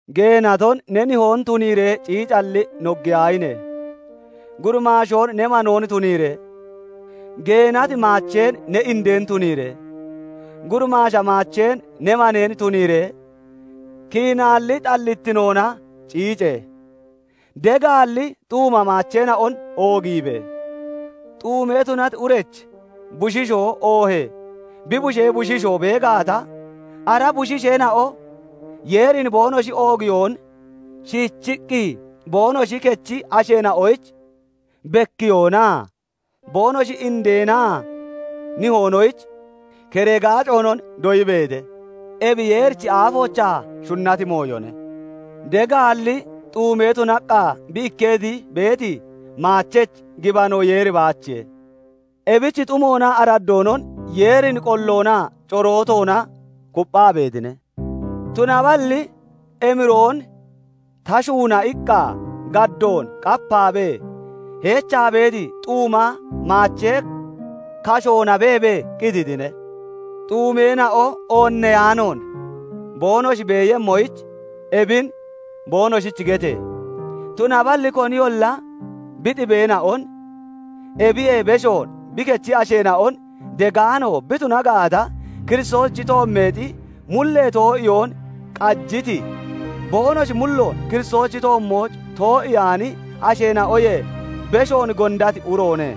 Geenaton ne nihoon tuniiree ciicalli noggiyaahine! Gurimaashoon ne manoon tuniiree, geenati maacheen ne indeen tuniiree, gurimaasha maacheen ne maneen tuniiree kiinaalli xallittinoona ciice! Degaalli xuuma maacheena'on oogiibe! Xuume tunati urech bushiishoo oohee bi bushee bushiishoo bee gaata, ara bushiisheena'o Yeerin boonoshi oogiyoon shiichiqqi boonoshi kechi asheena'oyich bekkiyoonaa boonoshi indeenaa nihoonoyich keree gaaconon doyibeete. Ebi Yeerichi aafoochaa shunnati mooyone. Degaalli xuume tunaqqa bi ikketi beeti maachechi gibano Yeeri baachiye; ebich xumoonaa araddoonon Yeerin qolloonaa corootoona kupphaa beetine. Tunaballi "Emiroon ta shuuna" iqqa gaddoon qapaabee heechaa beeti xuuma maachee kashoona beebee qititine. Xuumeena'o oonneyaanoon boonoshi beeyemmoyich, ebin boonoshich gete! Tunaballi koniyolla bi xibeena'on, ebiyee beshoon bi kechi asheena'on degaano bi tuna gaata, Kiristoosichi toommeexi mullee too'iyoon qajiti, boonoshi mulloon Kiristoosichi toommooch too'iyaani asheena'oyee beshoon gondati uroone.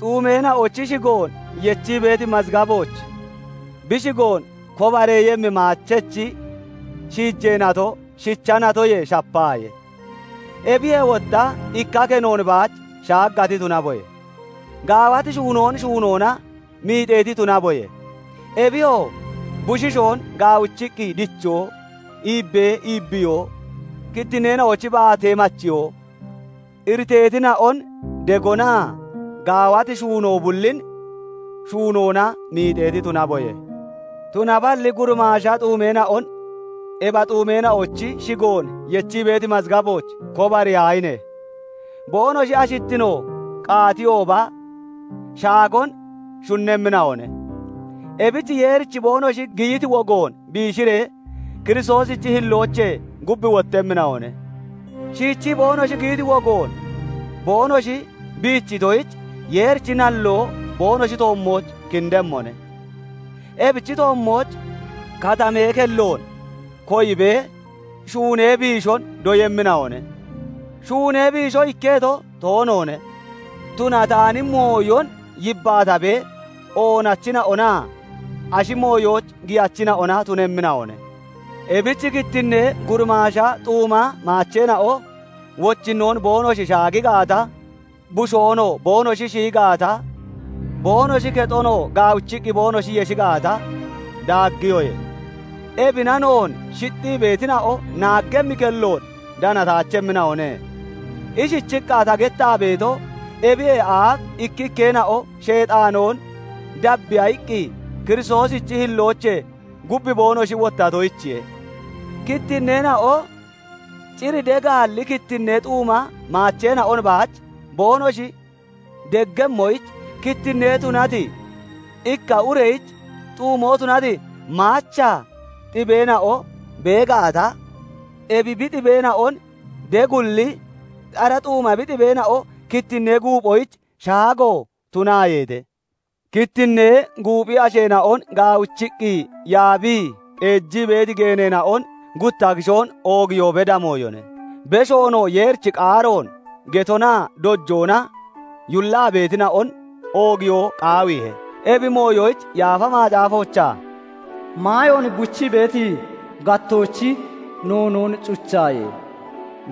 Xuumeena'ochi shigoon yechii beeti mazgabooch bi shigoon kobareeyemmi maachechi shiijee nato shicha natoyee shapaaye; ebiyee wotta ikka kenoon baach shaagati tunaboye; gaawati shuunoon shuunoona miixeeti tunaboye; ebiyoo, bushiishoon gaawichiqqi dichoo, iibbee iibbiyoo, kittinneena'ochi baatee machiyoo, iriteetina'on degonaa gaawati shuunoo bullin shuunoona miixeeti tunaboye. Tunaballi gurimaasha xuumeena'on ebi xuumeena'ochi shigoon yechii beeti mazgabooch kobariyaahine! Boonoshi ashittino qaatiyooba shaagoon shunnemmina'one; ebich Yeerich boonoshi giyiti wogoon biishiree, Kiristoosichi hilloochee gub wottemmina'one; shiichii boonoshi giyiti wogoon boonoshi biichitoyich, Yeerichi nalloo boonoshi toommooch kindemmone. Ebichi toommooch katamee kelloon koyibee shuunee biishon doyemmina'one; shuunee biisho ikketo toonoone; tunataani mooyon yibbaatabee oonachina'onaa ashi mooyooch giyachina'ona tunemmina'one. Ebich kittinnee gurimaasha xuuma maacheena'o wochinnoon boonoshi shaagi gaata, bushoonoo boonoshi shiyi gaata, boonoshi kexonoo gaawichiqqi boonoshi yeshi gaata, daaggiyoye; ebina noon shixxii beetina'o naaggemmi kelloon danataachemmina'one. Ishichiqqa ta gettaa beeto, ebiyee aaf ikkikkeena'o Sheexaanoon dabbiya iqqi Kiristoosichi hilloochee gub boonoshi wottatoyichiye. Kittinneena'o cir degaalli kittinnee xuuma maacheena'on baach boonoshi deggemmoyich, kittinne tunati ikka ureyich xuumoo tunati maacha xibeena'o bee gaata, ebi bi xibeena'on deggualli, ara xuuma bi xibeena'o kittinnee guuphoyich shaago tunaayeete. Kittinnee guuphi asheena'on gaawichiqqi yaabii qeejii beeti geeneena'on gutta kishoon oogiyoo beda mooyone; beshoonoo Yeerichi qaaroon getonaa dojoona yullaa beetina'on oogiyoo qaawiihe. Ebi mooyoyich Yaafa Macaafoochaa "Maayoon buchii beeti gattoochi noonoon cuchaaye!"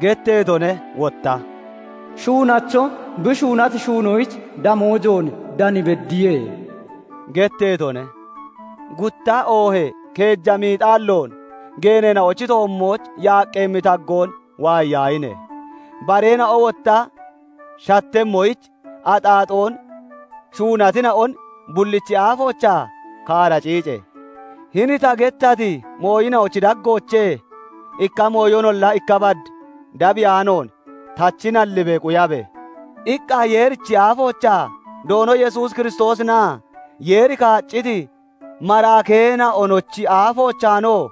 getteetone; wotta "Shuunacho bi shuunati shuunoyich damoojoon dan beddiye" getteetone. Gutta oohee keeja miixaalloon, geeneena'ochi toommooch yaaqqeemmi taggoon waayiyaahine! Bareena'o wotta shattemmoyich, axaaxoon shuunatina'on bullichi aafoochaa kaara ciice! "Hini ta gettati mooyina'ochi daggoochee ikka mooyonolla ikka bad dabiyaanoon, tachi nallibee quyabe!" iqqa Yeerichi aafoochaa, Doono Kiristoos Yesuusinaa Yeeri kaacciti maraakeenanochi aafoochaanoo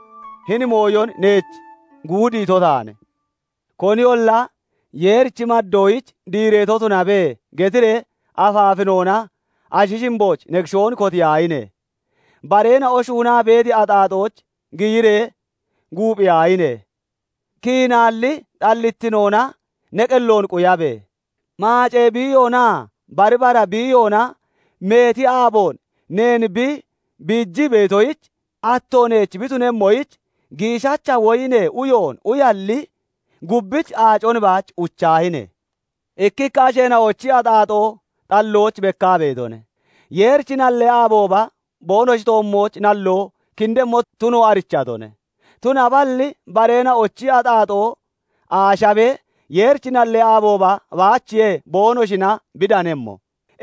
hini mooyon neech guudiito taane. Koninolla "Yeerich maddoyich diireeto tunabe!" getiree afaafinoona ashi shimbooch ne kishoon kotiyaahine! Bareena'o shuunaa beeti axaaxooch giyiree guuphiyaahine! Kiinaalli xallittinoona ne qelloon quyabe! Maacee biiyoonaa bari bara biiyoona meeti aaboon neen bi biijii beetoyich, atto neech bi tunemmoyich, giishacha woyinee uyoon uyalli, gubbich aacon baach uchaahine! Ikkikka asheena'ochi axaaxoo xallooch bekkaa beetone; Yeerichi nallee aabooba boonoshi toommooch nalloo kindemmo tuno arichatone; tunaballi bareena'ochi axaaxoo aashabee Yeerichi nallee aabooba baachiye boonoshina bi danemmo.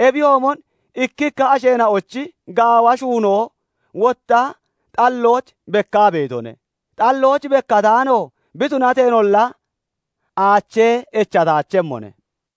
Ebiyoomon ikkikka asheena'ochi gaawa shuunoo wotta xallooch bekkaa beetone; xallooch bekkataano bi tunateenolla, aachee echataachemmone.